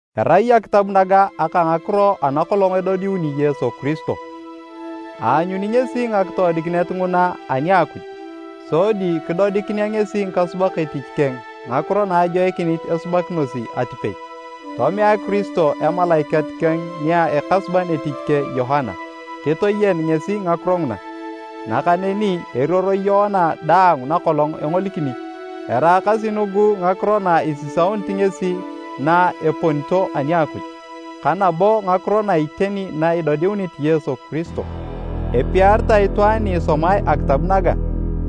Erai akitab naga aka ngakiro ana kolong edodiuni Yesu Kiristo. Aanyuni ngesi ngakitoodikinet nguna ani a Akuj, sodi kidodikinea ngesi ngikasubak etich keng ngakiro na ajoikinit esubakinosi atipei. Tomea Kiristo emalaikat keng nia ekasuban etich keng Yoana, kitoyen ngesi ngakiro nguna, nakaneni eruoro Yoana daang nakolong engolikini. Eraakasi nugu ngakiro na isisaunit ngesi na eponito ani a Akuj, ka nabo ngakiro na iteni na idodiunit Yesu Kiristo. Epiaritae itwaan ni isomae akitab naga,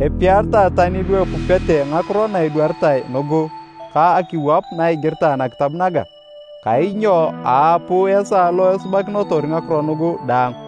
epiaritae tani lu epupete ngakiro na edwaritae nugu ka akiwap na igiritae nakitab naga! Kainyo aapuu esaa lo esubakinotor ngakiro nugu daang.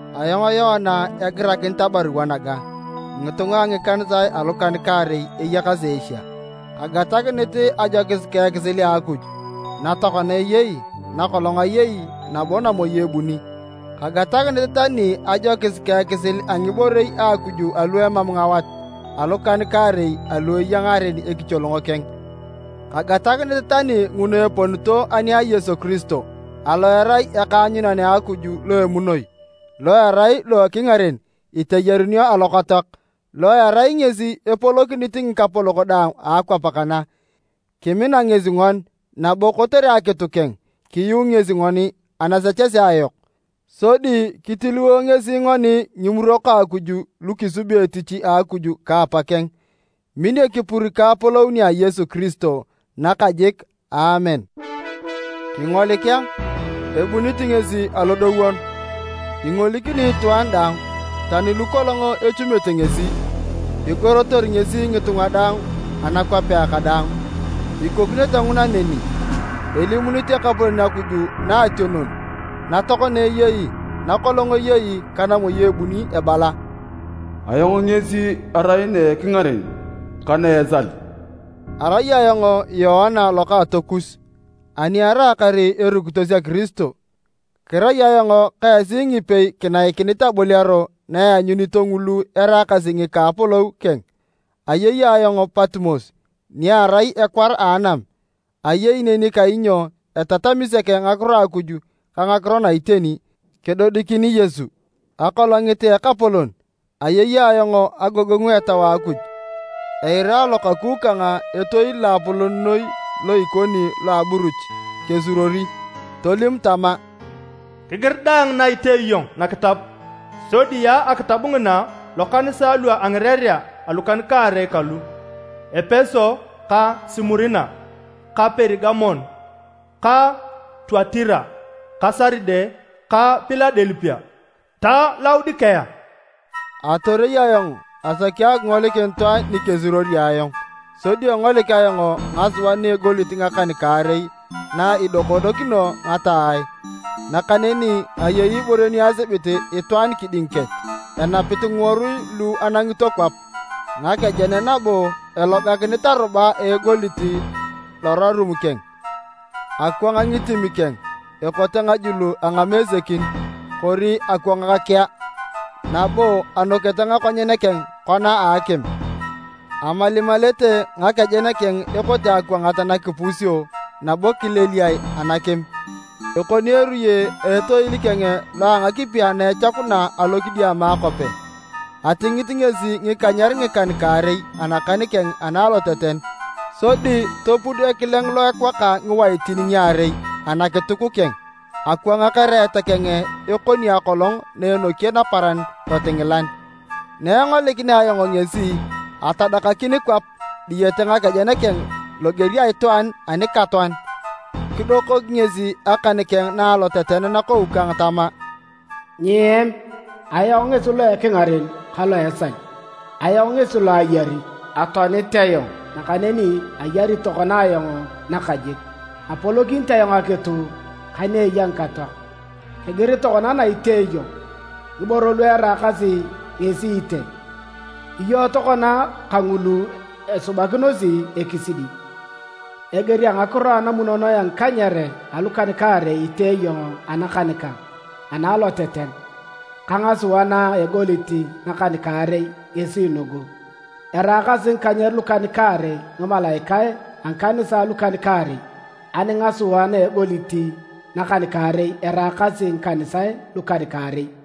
Ayong Yoana egirakinit abarua naga ngitunga a ngikanisae alukan-kaarei eyakasi Asia: Kagatakinit ajokis ka ekisil a Akuj, na tokona eyei, na kolong ayei nabo namoi ebuni. Kagatakinit tani ajokis ka ekisil a ngiborei a Akuj alu emam ngawat alukan-kaarei alu eya ngaren ekicholong keng, kagatakinit tani nguna eponito ani a Yesu Kiristo alo erai ekaanyunan a Akuj lo emunoi, lo erai lo ekingaren iteyarunio alokatoak, lo erai ngesi epolokinit ngikapolok daang a akwap kana. Kimina ngesi ngoni, nabo kotere akitu keng, kiyuu ngesi ngoni anasechesea yok sodi kitiliwo ngesi ngoni ngimurok a Akuj lu kisubi etich a Akuj ka apakeng. Min ekipur ka apolou nia Yesu Kiristo nakajik! Aamen. Kingolik a, ebunit ngesi alodowon! Ingolikini itwaan daang, tani lukolong echumete ngesi. Igorotor ngesi ngitunga daang anakwapea kadaang. Ikokinete nguna neni! Elimunit Ekapolon Akuj Naationon, na tokona eyei, na kolong ayei ka namoi ebuni ebala, “Ayong ngesi arai na ekingaren ka na esal.” Arai ayong Yoana lokaatokus, ani araakar erukitos a Kiristo, kirai ayong ka esi ngipei kinaikinit aboliaro na eanyunito ngulu eraakasi ngika a apolou keng. Ayei ayong Patimos, ni arai ekwar a anam, ayei neni kainyo etatami sek Ngakiro a Akuj ka ngakiro na iteni kedodikini Yesu. Akolongit a Ekapolon, ayei ayong agogongu a Etau a Akuj, eira alokaku kang etoil loapolon noi lo ikoni loa aburuch kesuruori. Tolim tama, “Kigir daang na itee iyong nakitab, sodi yaa akitab ngina lokanisae lua ngirerea alukan-kaarei kalu: Epeso ka Simurina ka Perigamon ka Tuatira ka Saride ka Piladelipia ta Laodikea.” Atorei ayong asaki akingolikin itwaan ni kesuruori ayong, sodi engolik ayong ngasua na a egolit ngakan-kaarei na idokonokinio ngataae. Nakaneni ayei ibore ni asibit itwaan kiding kech, enapit ngiworui lu anangito kwap ngakejen nabo elogakinit aruba a egolit lorarum keng. Akwang ngitim keng ekote ngajul a ngamesekin, kori akwang kea, nabo anokete ngakonyen keng kona a akim. Amalimalete ngakejen keng ekote akwangat na kipusio nabo kileliae anakim. Ekoni eruye a etoil keng lo a ngakipi ana echakuna alokidiama akope. Atingit ngesi ngikanyer ngikan-kaarei anakan keng ana aloteten sodi topud ekileng lo ekwaka ngiwaitin ngiarei anakituk keng. Akwang ereet keng ekoni akolong na enoki naparan lotingilan. Na engolikinea ayong ngesi, atadakakin kwap diyete ngakejen keng loger a itwaan anikatoan. Kidokok ngesi akan keng na aloteten nakou kang tama, “Nyiem! Ayong ngesi lo ekingaren ka lo a esal. Ayong ngesi lo ayari! Atoanit ayong, nakaneni ayari tokona ayong nakajik! Apolokinit ayong akitu ka ni eya ngikatoak. Kigir tokona na itee iyong, ngiboro lu eraakasi ngesi itee iyong tokona kangulu esubakinosi ekisidi. Eger a ngakiro ana munonoe a ngikanyer alukan-kaarei itee iyong anakan kang ana aloteten, ka ngasua na a egolit nakan-kaarei ngesi nugu, eraakasi ngikanyer lukan-kaarei ngimalaikae a ngikanisae alukan-kaarei, ani ngasua na egolit nakan-kaarei, eraakasi ngikanisae lukan-kaarei.